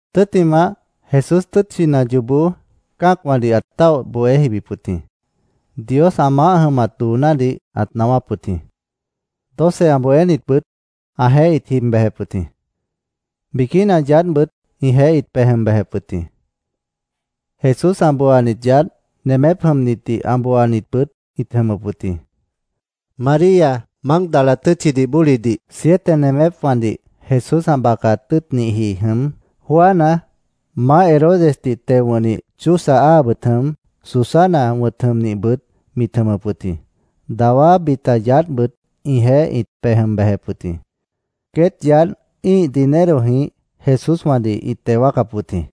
Tʉ́ttimah, Jesús tʉ́tchina yoobó cã́acwãdih ãt táoh bohé jibip wʉt jĩ. Dios ã maáh jʉmat doonádih ãt naáwáp wʉt jĩ. Doce ã bohénitbʉt ãjeéh ĩt jib bejep wʉt jĩ. Biquína yaádhbʉt ĩjeéh ĩt pej jʉm bejep wʉt jĩ. Jesús ã booanit yaádh, nemép jʉmnitdih ã booanitbʉt ĩt jʉmʉp wʉt jĩ. María, Mágdala tʉ́tchidih bólidih siete nemépwãdih Jesús ã bacat tʉ́ʉtnihji jʉm, Juana, Maáh Herodesdih teo wʉ̃hni Chuza áabʉt jʉm, Susana wʉ̃t jʉmnihbʉt mit jʉmʉp wʉt jĩ. Dawá bita yaádhbʉt ĩjeéh ĩt pej jʉm bejep wʉt jĩ. Queét yaádh ĩ́ih dinerojĩh Jesúswãdih ĩt teo wáacap wʉt jĩ.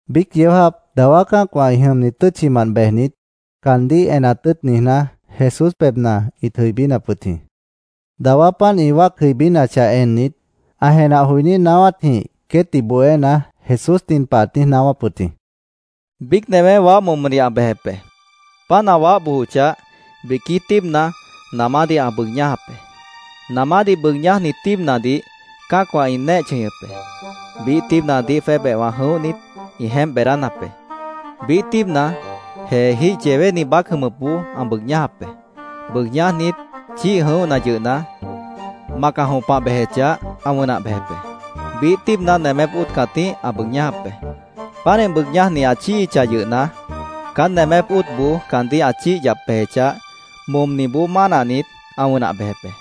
Biíc yeó jáap dawá cã́acwã ĩ jʉmni tʉ́tchinamant bejnit, caandíh enat tʉ́ʉt niijná, Jesús pebhna ĩt jʉibínap wʉt jĩ. Dawá páant ĩ wáac jʉibínachah ennit, ã jenah joiní naáwátjĩh queétdih bohéna, Jesús nin pah ãt niíj naáwáp wʉt jĩ: “Biíc newé waáh momodih ã bejep be. Páant ã waáh bojochah, biquí tíibna namádih ã bʉʉg ñájap be. Namádih bʉʉg ñájni tíibnadih cã́acwã ĩ néeh chʉñʉp be. Biíh tíibnadih jwébehwã jʉ̃óhnit, ĩ jeémp beedánap be. Biíh tíibna, jeejíh yewéni baác jʉmʉpboó ã bʉʉg ñájap be. Bʉʉg ñájnit, chíih jʉ̃óhna yʉhna, mac ã jõpah bejechah, ã wʉnah bejep be. Biíh tíibna nemép óot cãtíh ã bʉʉg ñájap be. Pánih bʉʉg ñájni ã chíihichah yʉhna, caán nemép óotboó caandíh ã chíih yap bejechah, momniboó mánahnit, ã wʉnah bejep be.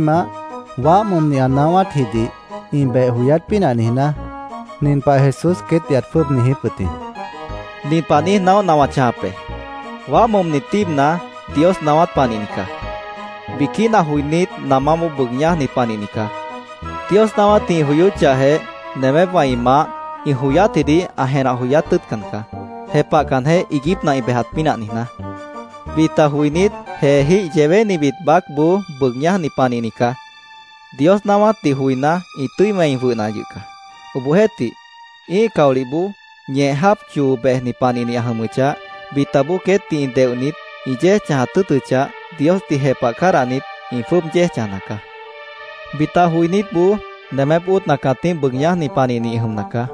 Tʉ́ttimah, waáh momni naáwátjidih ĩ beh joyát pínah niijná, nin pah Jesús queétdih ãt jwʉ́ʉb niijíp wʉt jĩ: “Nin pah niíj naóhna wã chãjap be: Waáh momni tíibna Dios naáwát panihni caá. Biquína joinít namáboó bʉʉg ñájni panihni caá. Dios naáwátdih ĩ joyóchahjeh, nemépwã ĩ maáh ĩ joyátjidih ã jenah joyát tʉ́ʉtcan caá, jepahcanjeh iiguípna ĩ bejat pínah niijná. Bita joinít jeejíh yewénibit baácboó bʉʉg ñájni panihni caá. Dios naáwátdih joiná, ĩ tʉ́i wẽi jwʉhna yʉh caá. Obohjeéhtih, ĩ́ih caolihboó ñeh jáap choo bejni panihni ã jʉmʉchah, bitaboó queétdih deohnit, ĩ yéej chãjat tʉ́ʉtʉchah, Diosdih jepah cádahnit, ĩ jwʉ́ʉb yéej chãjna caá. Bita joinítboó nemép óotna cãtíh bʉʉg ñájni panihni ĩ jʉmna caá.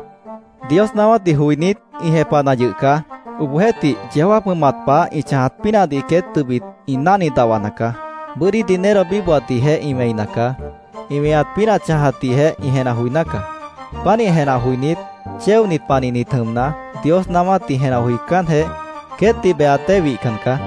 Dios naáwátdih joinít, ĩ jepahna yʉh caá. Obohjeéhtih, yeó jáap jʉmat pah ĩ chãjat pínahdih queét tʉbit ĩ náhni dahwana caá. Bʉ́dí dinero bíbohatdihjeh ĩ wẽina caá. Ĩ weñat pínah chãjatdihjeh ĩ jenah joiná caá. Pánih jenah joinít, chéonit panihnit jʉmna, Dios naáwátdih jenah joicánjeh, queétdih behat dée wihcan caá.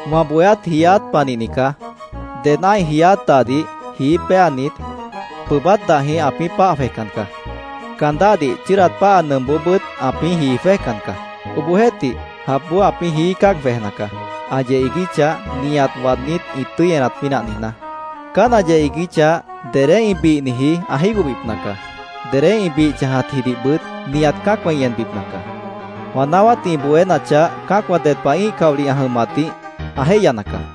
“Wã bohéát jiiát panihni caá. Ded ã́ih jiiát dahdih jií péanit, pʉʉbát dahjĩh ãpĩ́ páah jwejcan caá. Caan dáhdih chʉ́ʉdat páha nʉmpboobʉ́t ãpĩ́ jii jwéjcan caá. Obohjeéhtih, japboó ãpĩ́ jií cáag jwejna caá, ã yeh iiguíchah, nihat waadnít ĩ tʉ́i enat pínah niijná. Caán ã yeh iiguíchah, dedé ĩ bihniji ã jígohbipna caá. Dedé ĩ bih chãjatjidihbʉt nihat cã́acwã ĩ enbipna caá. Wã naáwátdih ĩ bohénachah, cã́acwã ded pah ĩ́ih caolih ã jʉmatdih ã jéihyana caá.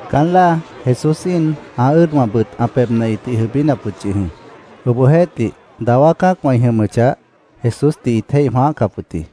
Caán láa Jesús íin ã ʉ́ʉdwãbʉt ã pebhna ĩtih jʉibínap wʉt yʉh jĩ. Obohjeéhtih, dawá cã́acwã ĩ jʉmʉchah, Jesúsdih ĩt jéih jwãáhcap wʉt jĩ.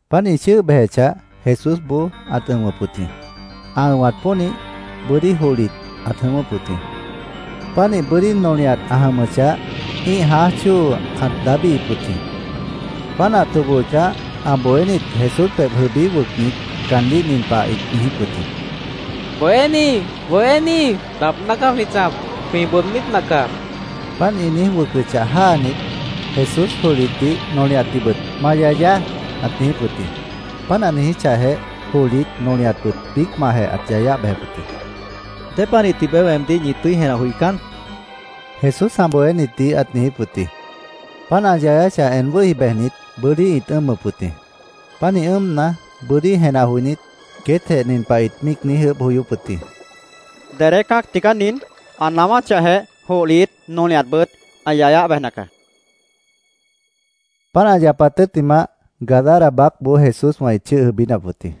Páant ĩ chʉ́ʉh bejechah, Jesúsboó ãt ʉ̃wʉp wʉt jĩ. Ã ʉ̃wat pónih, bʉ́dí johlit ãt jʉ̃ʉ́wʉ́p wʉt jĩ. Pánih bʉ́dí nolihat ã jʉmʉchah, ĩ́ih jãáj chóo ãt daábíhip wʉt jĩ. Páant ã tobohochah, ã bohénit Jesús pebh jʉibí wʉcnit, caandíh nin pah ĩt niijíp wʉt jĩ: —¡Bohéní, Bohéní, daabná caá jwĩ chãjap! ¡Jwĩ bʉʉdbípna caá! caandíh ĩt niijíp wʉt jĩ. Páant ĩ niíj wʉcʉchah, jáanit, Jesús johlitdih, nolihatdihbʉt “Ma yayaá”, ãt niijíp wʉt jĩ. Páant ã niijíchahjeh, johlit, nolihatbʉt biícmantjeh ãt yayáh bejep wʉt jĩ. —¿Dépanih tibeé weemdíh ñi tʉ́i jenah joicán? Jesús ã bohénitdih ãt niijíp wʉt jĩ. Páant ã yayánachah en wʉ́hi bejnit, bʉ́dí ĩt ʉ́ʉmʉp wʉt jĩ. Pánih ʉ́ʉmna, bʉ́dí jenah joinít, queétjeh nin pah ĩt míic niíj ʉʉ́bh joyóp wʉt jĩ: —¿Dedé cã́acna tigaá nin? Ã naáwáchahjeh, johlit, nolihatbʉt ã yayáh bejna caá, ĩt míic niijíp wʉt jĩ. Páant ã yapat tʉ́ttimah, Gadara baácboó Jesúswã ĩt chʉ́ʉh jʉibínap wʉt jĩ.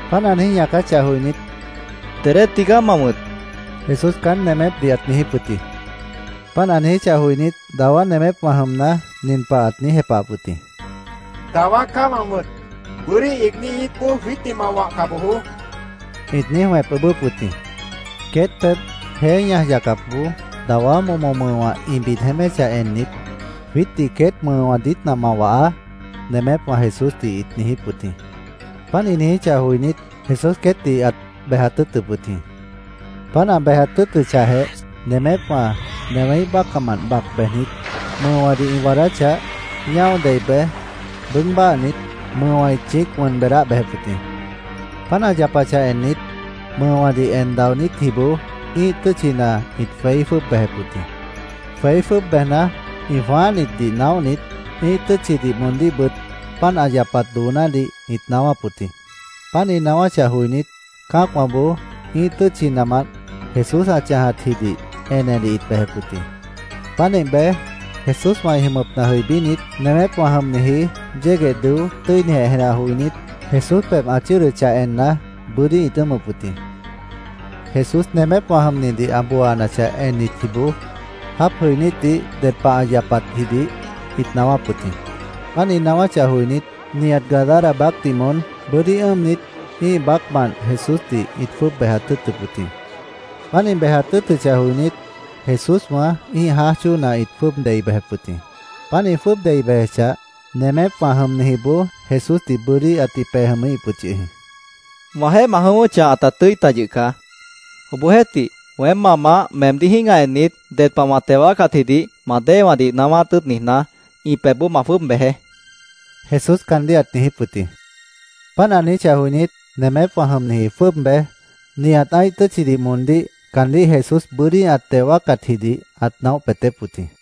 Páant ã niíj ñaacáchah joinít, —¿Dedé tigaá ma wʉ̃t? Jesús caán nemépdih ãt niijíp wʉt jĩ. Páant ã niijíchah joinít, dawá nemépwã jʉmna, nin pah ãt niíj jepahap wʉt jĩ: —‘Dawá’ caá wã wʉ̃t. ¡Bʉ́dí iigní íitboó jwiítdih ma wahca bojoó! ĩt niíj wẽp ʉʉ́bʉ́p wʉt jĩ. Queét pebh, jeé ñaj yacapboó dawá momo mʉʉwã ĩ bid jeéméchah ennit, —Jwiítdih queét mʉʉwã diítna ma wahaá, nemépwã Jesúsdih ĩt niijíp wʉt jĩ. Páant ĩ niijíchah joinít, Jesús queétdih ãt bejat tʉ́ʉtʉp wʉt jĩ. Páant ã bejat tʉ́ʉtʉchahjeh, nemépwã newéíh bácahmant bac bejnit, mʉʉwãdih ĩ waadáchah, ñáo dei bej, bʉʉg báhnit, mʉʉwã ĩt chĩíc wʉn beedáh bejep wʉt jĩ. Páant ã yapachah ennit, mʉʉwãdih en daonítjiboó ĩ́ih tʉ́tchina ĩt jweí jwʉ́ʉb bejep wʉt jĩ. Jweí jwʉ́ʉb bejna, ĩ jwãáhnitdih naóhnit, ĩ́ih tʉ́tchidih moondíhbʉt páant ã yapat doonádih ĩt naáwáp wʉt jĩ. Páant ĩ naáwáchah joinít, cã́acwãboó ĩ́ih tʉ́tchimant Jesús ã chãjatjidih enedih ĩt bejep wʉt jĩ. Pánih bej, Jesúswã ĩ jʉmʉpna jʉibínit, nemépwã jʉmniji yégueh dʉó, tʉ́inijeh jenah joinít, Jesús pebh ã chʉ́ʉdʉchah enna, bʉ́dí ĩt ʉ́ʉmʉp wʉt jĩ. Jesús nemépwã jʉmnidih ã booanachah ennitjiboó, jáap jʉinítdih ded pah ã yapatjidih ĩt naáwáp wʉt jĩ. Páant ĩ naáwáchah joinít, nihat Gadara baácdih moón bʉ́dí ʉ́ʉmnit, ĩ́ih baácmant Jesúsdih ĩt jwʉ́ʉb bejat tʉ́ʉtʉp wʉt jĩ. Páant ĩ bejat tʉ́ʉtʉchah joinít, Jesúswã ĩ́ih jãáj chóona ĩt jwʉ́ʉb dei bejep wʉt jĩ. Páant ĩ jwʉ́ʉb dei bejechah, nemépwã jʉmnijiboó Jesúsdih bʉ́dí ãtih pej jʉmíhip wʉt yʉh jĩ. —Wãjeéh ma jʉ̃ʉ́wʉ́chah, ãta tʉ́i ta yʉh caá. Obohjeéhtih, weém ma Maáh meemdíh jĩ́gah ennit, ded pah wã teo wáacatjidih ma déewãdih naáwát tʉ́ʉt niijná, ĩ pebhboó ma jwʉ́ʉb bejeé, Jesús caandíh ãt niijíp wʉt jĩ. Páant ã niijíchah joinít, nemépwã jʉmniji jwʉ́ʉb bej, nihat ã́ih tʉ́tchidih moondíh caandíh Jesús bʉ́dí ã teo wáacatjidih ãt naóh peetép wʉt jĩ.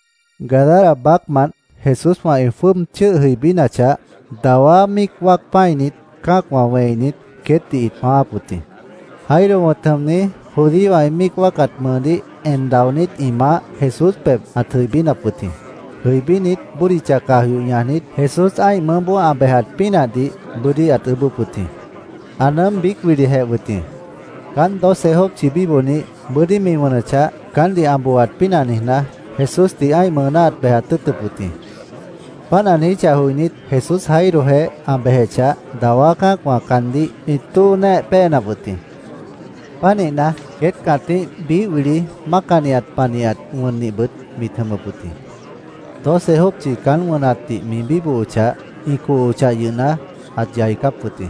Gadara baácmant Jesúswã ĩ jwʉ́ʉb chʉ́ʉh jʉibínachah, dawá míic wáac pã́init cã́acwã wẽinit, queétdih ĩt jwãááp wʉt jĩ. Jairo wʉ̃t jʉmni, judíowã ĩ míic wáacat mʉʉdíh en daonít ĩ maáh, Jesús pebh ãt jʉibínap wʉt jĩ. Jʉibínit, bódicha caj yoh ñajnit, Jesús ã́ih mʉʉ́boó ã bejat pínahdih bʉ́dí ãt ʉʉ́bʉ́p wʉt jĩ. Ã nʉʉ́m biíc wilijeh wʉt jĩ. Caánt doce jópchi bíbohnih, bʉ́dí mi wʉnʉchah, caántdih ã booaat pínah niijná, Jesúsdih ã́ih mʉʉná ãt bejat tʉ́ʉtʉp wʉt jĩ. Páant ã niijíchah joinít, Jesús Jairojeéh ã bejechah, dawá cã́acwã caandíh ĩt tóo néeh péenap wʉt jĩ. Pánihna, queét cãtíh biíh wili mácanihat panihat wʉnnihbʉt mit jʉmʉp wʉt jĩ. Doce jópchi caán wʉnatdih mi bíbohochah, ĩ cohochah yʉhna, ãt yaicáp wʉt jĩ.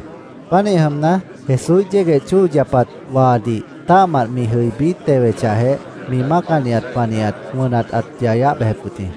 Pánih jʉmna, Jesúíh yégueh chóo yapat waadih tã́ahmant mi jʉibí tewechahjeh, mi mácanihat panihat wʉnat ãt yayáh bejep wʉt jĩ.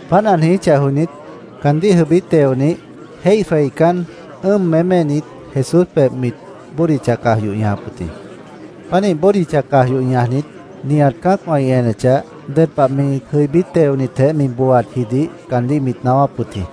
Páant ã niijíchah joinít, caandíh jʉibí teonih, jéih jweicán, ʉ́ʉm méménit, Jesús pebh mit bódicha caj yoh ñajap wʉt jĩ. Pánih bódicha caj yoh ñajnit, nihat cã́acwã ĩ enechah, ded pah mi jʉibí teonitjeh booatjidih caandíh mit naáwáp wʉt jĩ.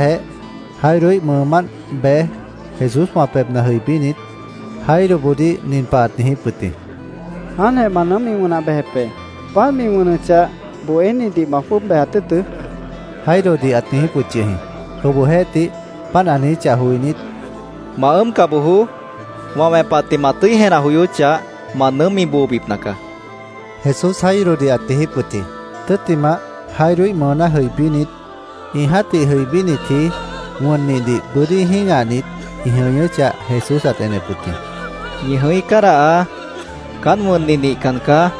Páant ã niijíchahjeh, Jairoíh mʉʉmánt bej, Jesúswã pebhna jʉibínit, Jairoboodíh nin pah ãt niijíp wʉt jĩ: —Jáantjeh ma nʉʉ́m mi mʉʉjáh bejep be. Páant mi wʉnʉchah, bohénidih ma jwʉ́ʉb bejat tʉ́ʉtʉ́, Jairodih ãt niijíp wʉt yʉh jĩ. Obohjeéhtih, páant ã niijíchah joinít, —Ma ʉ́ʉmca bojoó. Wã wẽpatdih ma tʉ́i jenah joyóchah, ma nʉʉ́m mi boobipna caá, Jesús Jairodih ãt niijíp wʉt jĩ. Tʉ́ttimah, Jairoíh mʉʉná jʉibínit, ĩ jã́tih jʉibínitji wʉnnihdih bʉ́dí jĩ́gahnit, ĩ jʉñʉ́chah, Jesús ãt enep wʉt jĩ. —Ñi jʉ̃í cádahaá. Caánt wʉnnih nihcan caá.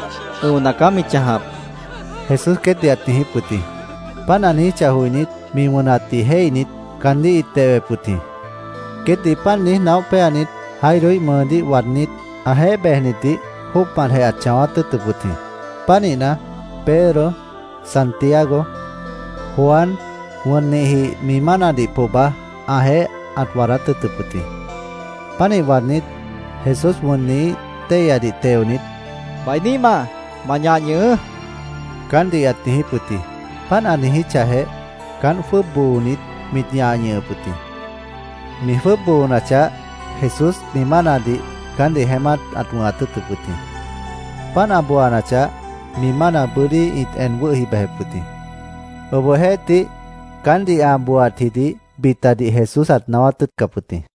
Ʉ̃ona caá mi chãjap, Jesús queétdih ãt niijíp wʉt jĩ. Páant ã niijíchah joinít, mi wʉnatdih jéihnit, caandíh ĩt dehwep wʉt jĩ. Queétdih páant niíj naóh péanit, Jairoíh mʉʉdíh waadnít, ãjeéh bejnitdih jóocmantjeh ãt chãwát tʉ́ʉtʉp wʉt jĩ. Pánihna, Pedro, Santiago, Juan, wʉnnihji mi mánadih pohba ãjeéh ãt waadát tʉ́ʉtʉp wʉt jĩ. Pánih waadnít, Jesús wʉnnihíh téihyadih teonit, —¡Bainíhmaá, ma ñah ñʉhʉʉ́! caántdih ãt niijíp wʉt jĩ. Páant ã niijíchahjeh, caánt jwʉ́ʉb boonit, mit ñah ñʉhʉp wʉt jĩ. Mi jwʉ́ʉb boonachah, Jesús mi mánadih caántdih jeémát ãt wʉ̃hat tʉ́ʉtʉp wʉt jĩ. Páant ã booanachah, mi mána bʉ́dí ĩt en wʉ́hi bejep wʉt jĩ. Obohjeéhtih, caántdih ã booaatjidih bitadih Jesús ãt naáwát tʉ́ʉtcap wʉt jĩ.